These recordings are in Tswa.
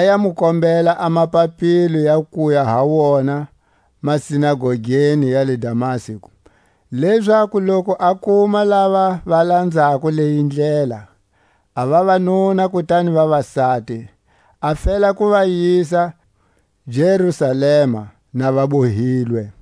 a ya mu kombela a mapapilo ya kuya ha wona masinagogeni ya le Damasku, lezaku loku a kuma lava va lanzako leyi Ndlela, a vavanuna kutani vavasati, a fela ku va yisa Jerusalema na va bohilwe.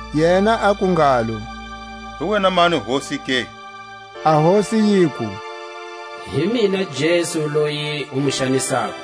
Yena aku ngalo: Hi wena mani Hosi ke? A Hosi yiku: Hi mina Jesu loyi u mu xanisako.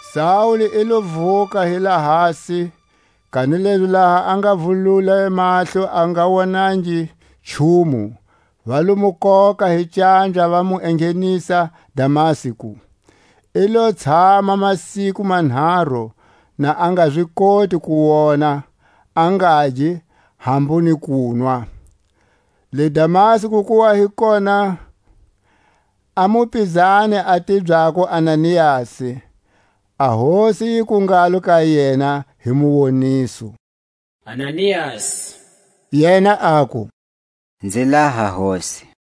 Saule i lo vuka hi lahasi; kanilezi laha a nga vulule mahlo a nga wonangi nchumu; va lo mu koka hi canja, va mu enghenisa Damasku. I lo tshama masiku manharu na a nga zi koti ku wona, a ngagi, hambu ni kunwa. Le Damasku ku wa hi kona a mupizani a tibyako Ananiasi. A Hosi yiku ngalo ka yena hi muwoniso: Ananiasi. Yena aku: Nzi laha, Hosi.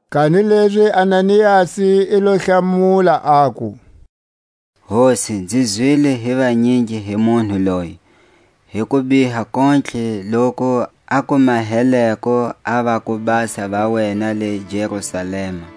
Kanilezi Ananiasi i lo hlamula, aku: Hosi, nzi zwile hi vanyingi hi munhu loyi, hi kubiha kontlhe loku a ku maheleko a vakubasa va wena le Jerusalema;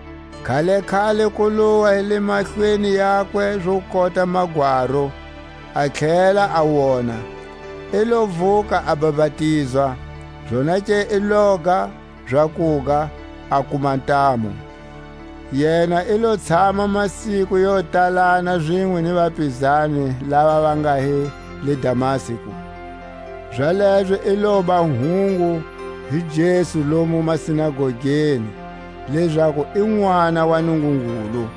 Khalekhale ku lowa hi le mahlweni yakwe zo kota magwaru, a tlhela a wona; i lo vuka a bapatizwa. Zonake i loga zakuga, a kuma ntamu. Yena i lo tshama masiku yo talana zinwe ni vapizani lava va nga hi le Damasku. Zalezo i loba hungu hi Jesu lomu masinagogeni, lezaku i Nʼwana wa Nungungulu.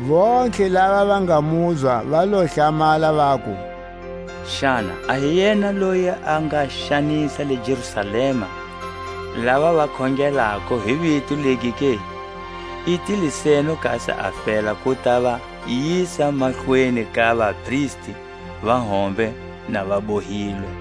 Vontlhe lava va nga muzwa va lo hlamala, vaku: Xana a hi yena loyi a nga xanisa le Jerusalema lava va khongelako hi vito legi ke? I tile seno kasi a fela ku ta va yisa mahlweni ka vapristi va hombe na va bohilwe.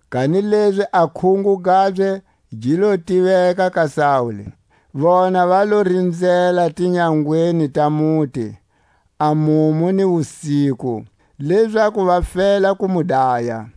kanilezi a khungo gabye gi lo tiveka ka Saule. Vona va lo rinzela tinyangweni ta muti a mumu ni wusiku, lezaku va fela ku mu daya;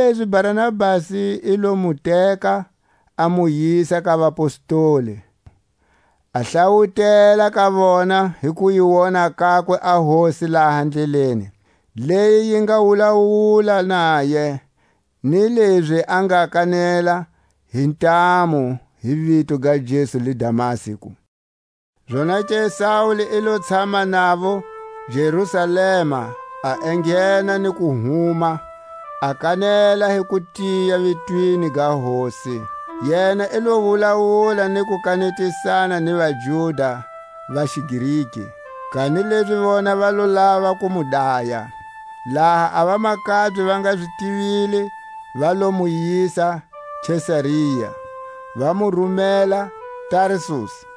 Kanilezi Barnabasi i lo mu teka, a mu yisa ka vapostoli, a hlawutela ka vona hi ku yi wona kakwe a Hosi laha ndleleni, leyi yi nga wulawula naye; ni lezi a nga kanela hi ntamu hi vito ga Jesu le Damasku, Zonake Saule i lo tshama navo Jerusalema, a enghena ni ku huma, a kanela hi kutiya vitweni ga Hosi. Yena i lo wulawula ni ku kanetisana ni vaJuda va xiGreki; kanilezi vona va lo lava ku mu daya. Laha a vamakabye va nga zi tivile, va lo mu yisa Kesaria, va mu rumela Tarsusi.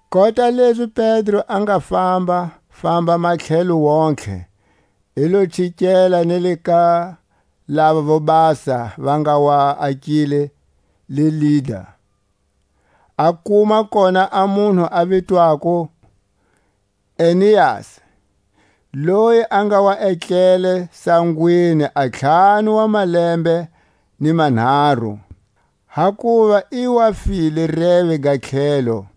Kota lezi Pedro a nga fambafamba matlhelweni wontihe, i lo chikela ni ka lavo vobasa va nga wa akile le Lida. A kuma kona a munhu a vitwako Eneasi, loyi a nga wa etlele sangweni a ntlhanu wa malembe ni manharu, hakuva i wa file reve ga tlhelo.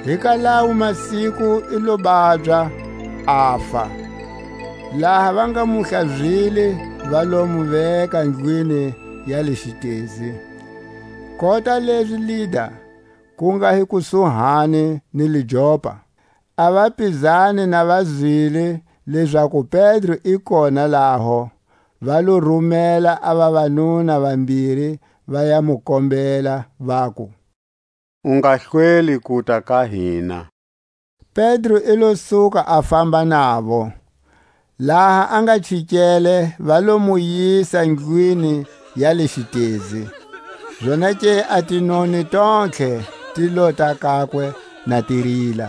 Hi ka lawo masiku i lo babya, afa. Laha va nga mu hlazile, va lo mu veka ndlwini ya le xitezi. Kota lezi Lida ku nga hi kusuhani ni le Jopa, a vapizani na va zwile lezaku Pedro i kona laho, va lo rumela a vavanuna vambiri, va ya mu kombela vaku: U nga hlweli kuta ka hina. Pedro i lo suka a famba navo. Laha a nga chikele va lo mu yisa ndlwini ya le xitezi; zonake a tinoni tontlhe ti lota kakwe na ti rila,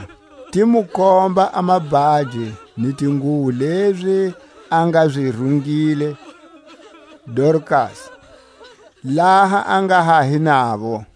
ti mu komba a mabhaji ni tinguwo lezi a nga zi rungile Dorkasi laha a nga ha hi navo.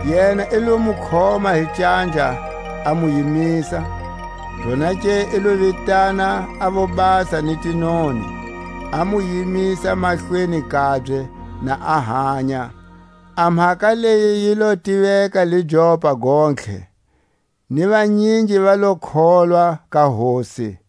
Yena i lo mu khoma hi canja, a mu yimisa; zonake i lo vitana a vobasa ni tinoni, a mu yimisa mahlweni kabye, na a hanya. A mhaka leyi yi lo tiveka le Jopa gontlhe, ni vanyingi va lo kholwa ka Hosi.